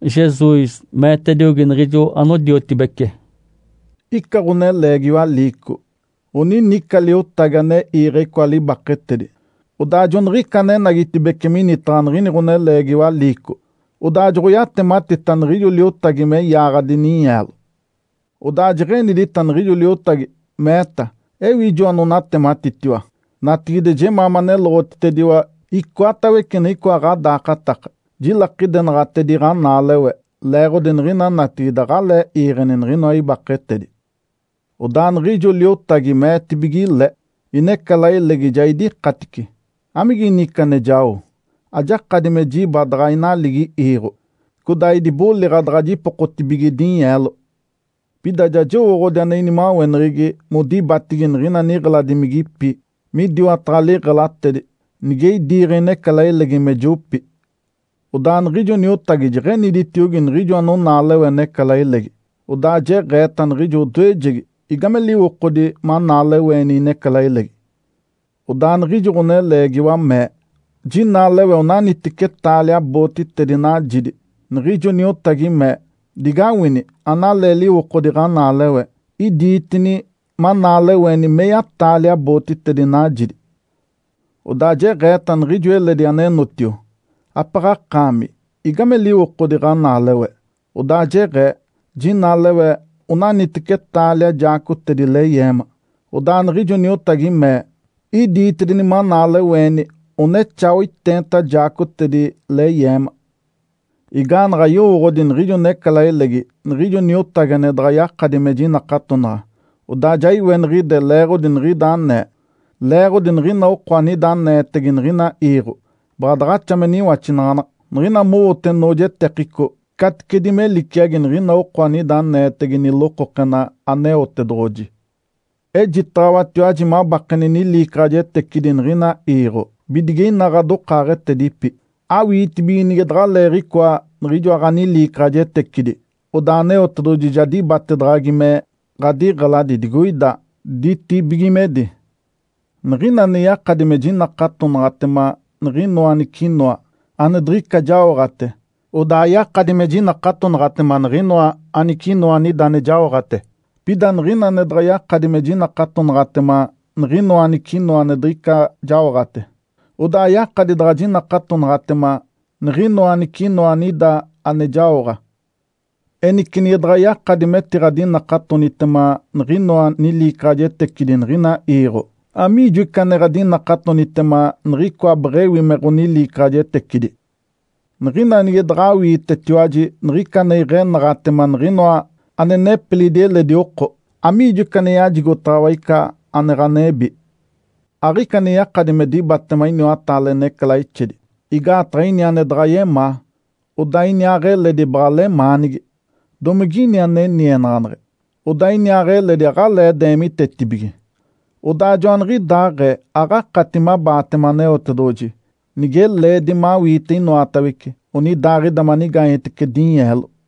Jesus meetediogi niɡ̶ijo anodiotibece, “Ica ɡ̶oneleegiwa liico, oninica liotagi ane iiɡ̶e icoa libaketedi. Odaa joniɡ̶ica anenagitibeci minitaɡ̶a niɡ̶ini ɡ̶oneleegiwa liico, odaa joɡ̶oyatematita niɡ̶ijo liotagi me yaaɡ̶adi ninyeelo. Odaa jeɡ̶enidita niɡ̶ijo liotagi, meeta, ‘Ewi ijo anonatematitiwa? Natigide jemaa maneloɡ̶otitediwa icoatawece niɡ̶icoa ɡ̶adaakataka, jilakidenaɡ̶atedi ɡ̶anaalewe, leeɡ̶odi niɡ̶ina natigide aɡ̶alee iiɡ̶eni niɡ̶inoa ibaketedi.’ Odaa niɡ̶ijo liotagi meetibige le, ‘Inecalailegi ja idikatice. Amigini ica ane jao? Ajakadi me jiba daɡ̶a inaligi iiɡ̶o, codaa idiboliɡ̶a daɡ̶a jipokotibige dinyeelo. Pida ja jowooɡ̶odi ane inimaweneɡ̶egi modibatigi niɡ̶ina niɡ̶eladimigipi midiwataɡ̶a liɡ̶elatedi, nige idiiɡ̶e inecalailegi me jopi.’ Odaa niɡ̶ijo niotagi jeɡ̶eniditiogi niɡ̶ijo anonaalewe necalailegi. Odaa jeɡ̶eeta niɡ̶ijo odoejegi, ‘Igame liwokodi manaaleweeni inecalailegi?’ Odaa niɡ̶ijo ɡ̶oneleegiwa mee, ‘Jinaalewe onaniteci taalia bootitedi najidi.’ Niɡ̶ijo niotagi mee, ‘Digawini analee liwokodi ɡ̶anaalewe. Idiitini manaaleweeni meya-taalia bootitedi najidi.’ Odaa jeɡ̶eeta niɡ̶ijo eledi anenotio, ‘Apaɡ̶a akaami, igame liwokodi ɡ̶anaalewe?’ Odaa jeɡ̶ee, ‘Jinaalewe onaniteci taalia jaacotedi leyeema.’ Odaa niɡ̶ijo niotagi mee, ‘Idiitedini manaaleweeni onexaa oiteenta jaacotedi leyeema.’ Igaanaɡ̶a yowooɡ̶odi niɡ̶ijo necalailegi niɡ̶ijo niotagi ane daɡ̶a yakadi me jinakatonaɡ̶a, odaa ja iweniɡ̶ide leeɡ̶odi niɡ̶ida anee. Leeɡ̶odi niɡ̶ina oko anida aneetege niɡ̶ina iiɡ̶o, baɡ̶a daɡ̶axa me niwaxinaɡ̶anaɡ̶a, niɡ̶ina mowote noojetekico caticedi me liciagi niɡ̶ina oko anida aneetege nilokokena Aneotedoɡ̶oji. Ejitaɡ̶awatiwaji mabakeni niliicaɡ̶ajetecidi niɡ̶ina iiɡ̶o bidige ina ɡ̶adokaaɡ̶etedipi, awiitibige nige daɡ̶aleeɡ̶icoa niɡ̶ijoa ɡ̶aniliicaɡ̶ajetecidi, odaa Aneotedoɡ̶oji ja dibatedaɡ̶agi me ɡ̶adiɡ̶eladi digoida ditibigimedi. Niɡ̶ina ane yakadi me jinakatonaɡ̶atema niɡ̶inoa anicinoa ane diɡ̶ica jaoɡ̶ate, odaa yakadi me jinakatonaɡ̶atema niɡ̶inoa anicinoa anida ane jaoɡ̶ate. Pida niɡ̶ina ane daɡ̶a yakadi me jinakatonaɡ̶atema niɡ̶inoa anicinoa ane diɡ̶ica jaoɡ̶ate, odaa ayakadi daɡ̶a jinakatonaɡ̶atema niɡ̶inoa anicinoa anida ane jaoɡ̶a. Enice nige daɡ̶a yakadi metiɡ̶adinakatonitema niɡ̶inoa niliicaɡ̶ajetecidi niɡ̶ina iiɡ̶o, amiijo ica ane ɡ̶adinakatonitema niɡ̶icoa beɡ̶ewi me ɡ̶oniliicaɡ̶ajetecidi? Niɡ̶ina nige daɡ̶awiitetiwaji niɡ̶ica ane iɡ̶enaɡ̶atema niɡ̶inoa ane nepilidi eledi oko, amiijo ica ane yajigotaɡ̶awa ica ane ɡ̶anebi? Aɡ̶ica ane yakadi me dibatema iniwataale necalaixedi, igaataɡ̶a ini ane daɡ̶a yemaa, odaa iniaaɡ̶eledi baɡ̶a lemaanigi, domige ini ane nienaɡ̶aneɡ̶e, odaa iniaaɡ̶eledi aɡ̶alee deemitetibige. Odaa joaniɡ̶idaaɡ̶ee aɡ̶akati mabaatema Aneotedoɡ̶oji, nige leedi mawiite inoatawece onidaaɡ̶ida manigaanyetece dinyeelo.”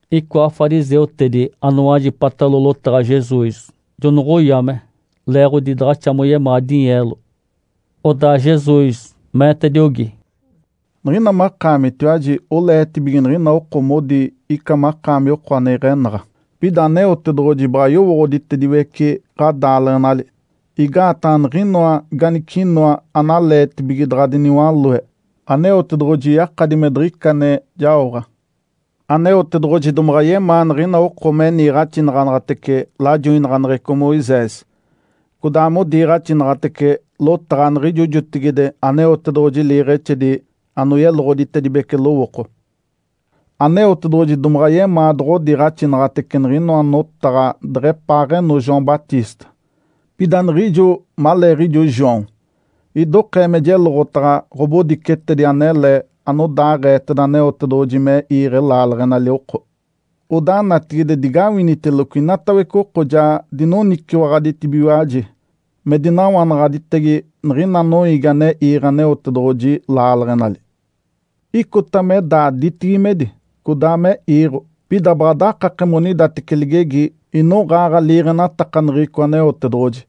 Icoa fariseutedi anowajipatalo lotaɡ̶a Jesus, jonoɡ̶oyame leeɡ̶odi daɡ̶axa moyemaa dinyeelo. Odaa Jesus meetediogi, “Niɡ̶ina makaamitiwaji oleetibige niɡ̶ina oko modi ica makaami oko ane iɡ̶enaɡ̶a, pida Aneotedoɡ̶oji baɡ̶a yowooɡ̶oditediwece ɡ̶adaaleɡ̶enali. Igaataɡ̶a niɡ̶inoa ganicinoa analeetibige daɡ̶a diniwaloe, Aneotedoɡ̶oji yakadi me diɡ̶ica ane jaoɡ̶a. Aneotedoɡ̶oji domaɡ̶a yemaa niɡ̶ina oko me niiɡ̶axinaɡ̶anaɡ̶atece lajoinaɡ̶aneɡ̶eco Moisés, codaa modiiɡ̶axinaɡ̶atece lotaɡ̶a niɡ̶ijo jotigide Aneotedoɡ̶oji liiɡ̶exedi anoyeloɡ̶oditedibece lowooko. Aneotedoɡ̶oji domaɡ̶a yemaa doɡ̶odiiɡ̶axinaɡ̶atece niɡ̶inoa notaɡ̶a deɡ̶epaaɡ̶eno João Batista. Pida niɡ̶ijo maleeɡ̶ijo João, idokee me jeloɡ̶otaɡ̶a ɡ̶obodicetedi anele anodaaɡ̶eeteda Aneotedoɡ̶oji me iiɡ̶e laaleɡ̶enali oko. Odaa natigide digawiniteloco inatawece oko ja dinoniciwaɡ̶aditibigiwaji me dinawanaɡ̶aditege niɡ̶ina noiigi ane iiɡ̶e Aneotedoɡ̶oji laaleɡ̶enali. Icota me daa ditibigimedi, codaa me iiɡ̶o, pida baɡ̶a dakake monidateci ligegi inoɡ̶aaɡ̶a liiɡ̶enatakaneɡ̶eco Aneotedoɡ̶oji.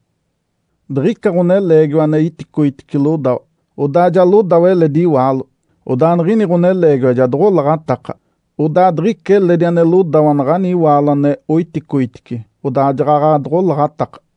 Diɡ̶ica ɡ̶oneleegiwa ane iticoitice lodawa, odaa ja lodawa eledi iwaalo. Odaa niɡ̶ini ɡ̶oneleegiwa ja doɡ̶olaɡ̶ataka. Odaa diɡ̶ica eledi ane lodawa naɡ̶ani iwaalo ane oiticoitice, odaa jaɡ̶aɡ̶a doɡ̶olaɡ̶ataka.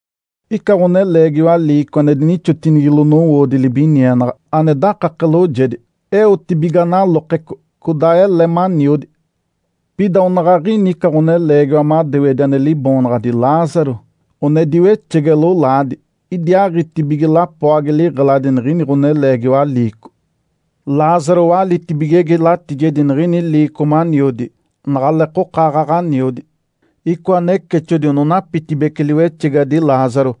Ica ɡ̶oneleegiwa liico ane dinixotinigilo nowoodi libinienaɡ̶a ane dakake loojedi. Eotibiga nalokeco, codaa ele maniodi. Pida onaɡ̶aɡ̶ini ica ɡ̶oneleegiwa madewedi ane liboonaɡ̶adi Lázaro, one diwexege lolaadi. Idiaaɡ̶itibige lapoagi liɡ̶eladi niɡ̶ini ɡ̶oneleegiwa liico. Lázaro walitibigege latijedi niɡ̶ini liico maniodi naɡ̶aleekoka aaɡ̶aɡ̶a aniodi. Icoa necexodi one onapitibece liwexegadi Lázaro.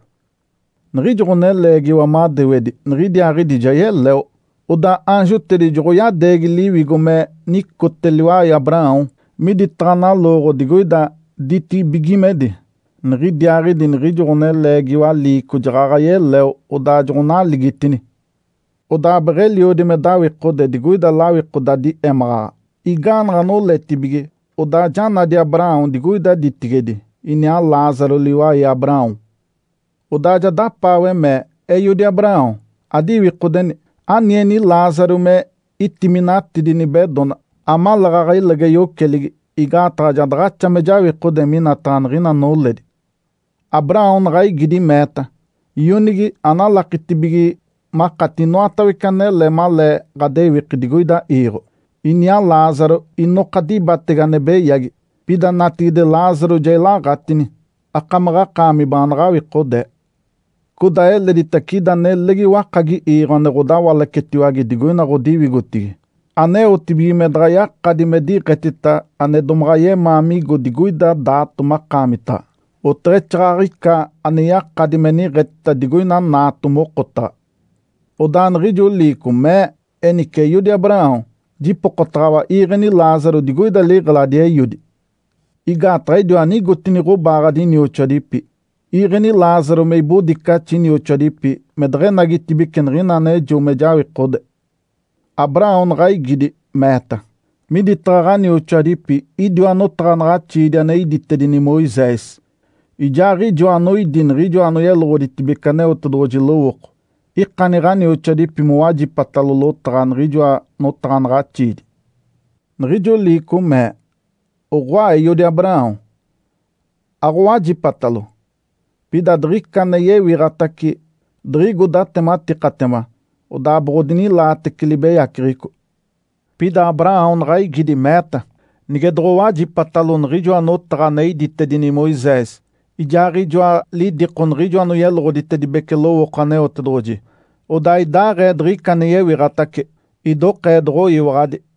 Niɡ̶ijo ɡ̶oneleegiwa madewedi niɡ̶idiaaɡ̶idi ja yeleo, odaa aanjotedi joɡ̶oyadeegi liwigo me nicote liwai Abraão miditaɡ̶a nalooɡ̶o digoida ditibigimedi. Niɡ̶idiaaɡ̶idi niɡ̶ijo ɡ̶oneleegiwa liico jaɡ̶aɡ̶a yeleo, odaa joɡ̶onaligitini. Odaa beɡ̶eliodi me dawikode digoida lawikodadi émaɡ̶aɡ̶a. Igaanaɡ̶a noletibige, odaa ja nadi Abraão digoida ditigedi, iniaa Lázaro liwai Abraão. Odaa ja dapaawe mee, ‘Eiodi Abraão, adiwikodeni! Anieni Lázaro me itiminatidi nibedona, amaleeɡ̶aɡ̶a ilege yoceligi, igaataɡ̶a ja daɡ̶axa me jawikode minataɡ̶a niɡ̶ina noledi.’ Abraão naɡ̶a igidi, meeta, ‘Ionigi, analakitibige makati inoatawece anele malee ɡ̶adewiki digoida iiɡ̶o, iniaa Lázaro inoka dibatege ane beyagi. Pida natigide Lázaro ja ilaɡ̶atini, akamaɡ̶akaami baanaɡ̶a awikodee. Codaa eleditace ida nelegi wakagi iiɡ̶o ane ɡ̶odawalacetiwage digoina ɡ̶odiwigotigi, aneotibige me daɡ̶a yakadi me diɡ̶etita ane domaɡ̶a yemaa migo digoida daato makaamitaɡ̶a, oteɡ̶exaaɡ̶aɡ̶ica ane yakadi me niɡ̶etita digoina naato mokotaɡ̶a.’ Odaa niɡ̶ijo liico mee, ‘Enice, eiodi Abraão, jipokotaɡ̶awa, iiɡ̶eni Lázaro digoida liɡ̶eladi eiodi. Igaataɡ̶a idiwa nigotini ɡ̶obaaɡ̶adi inioxoadipi. Iiɡ̶eni Lázaro me ibodicaxi inioxoadipi me deɡ̶enagitibeci niɡ̶ina anejo me jawikode.’ Abraão naɡ̶a igidi, meeta, ‘Miditaɡ̶a ɡ̶anioxoadipi idiwa notaɡ̶anaɡ̶axiidi ane iditedini Moisés, ijaaɡ̶ijoa anoidi niɡ̶ijo anoyeloɡ̶oditedibece Aneotedoɡ̶oji lowooko. Ikani ɡ̶anioxoadipi mowajipatalo lotaɡ̶a niɡ̶ijoa notaɡ̶anaɡ̶axiidi.’ Niɡ̶ijo liico mee, ‘Oɡ̶oa, eiodi Abraão, aɡ̶owajipatalo. Pida diɡ̶ica ane yewiɡ̶atace, diɡ̶igo datematikatema, odaa boɡ̶odinilaatece libeyaceɡ̶eco.’ Pida Abraão naɡ̶a igidi, meeta, ‘Nige doɡ̶owajipatalo niɡ̶ijoa notaɡ̶a ane iditedini Moisés, ijaaɡ̶ijoa lidiko niɡ̶ijo anoyeloɡ̶oditedibece lowooko Aneotedoɡ̶oji, odaa idaaɡ̶ee diɡ̶ica ane yewiɡ̶atace, idokee doɡ̶oyiwaɡ̶adi.’”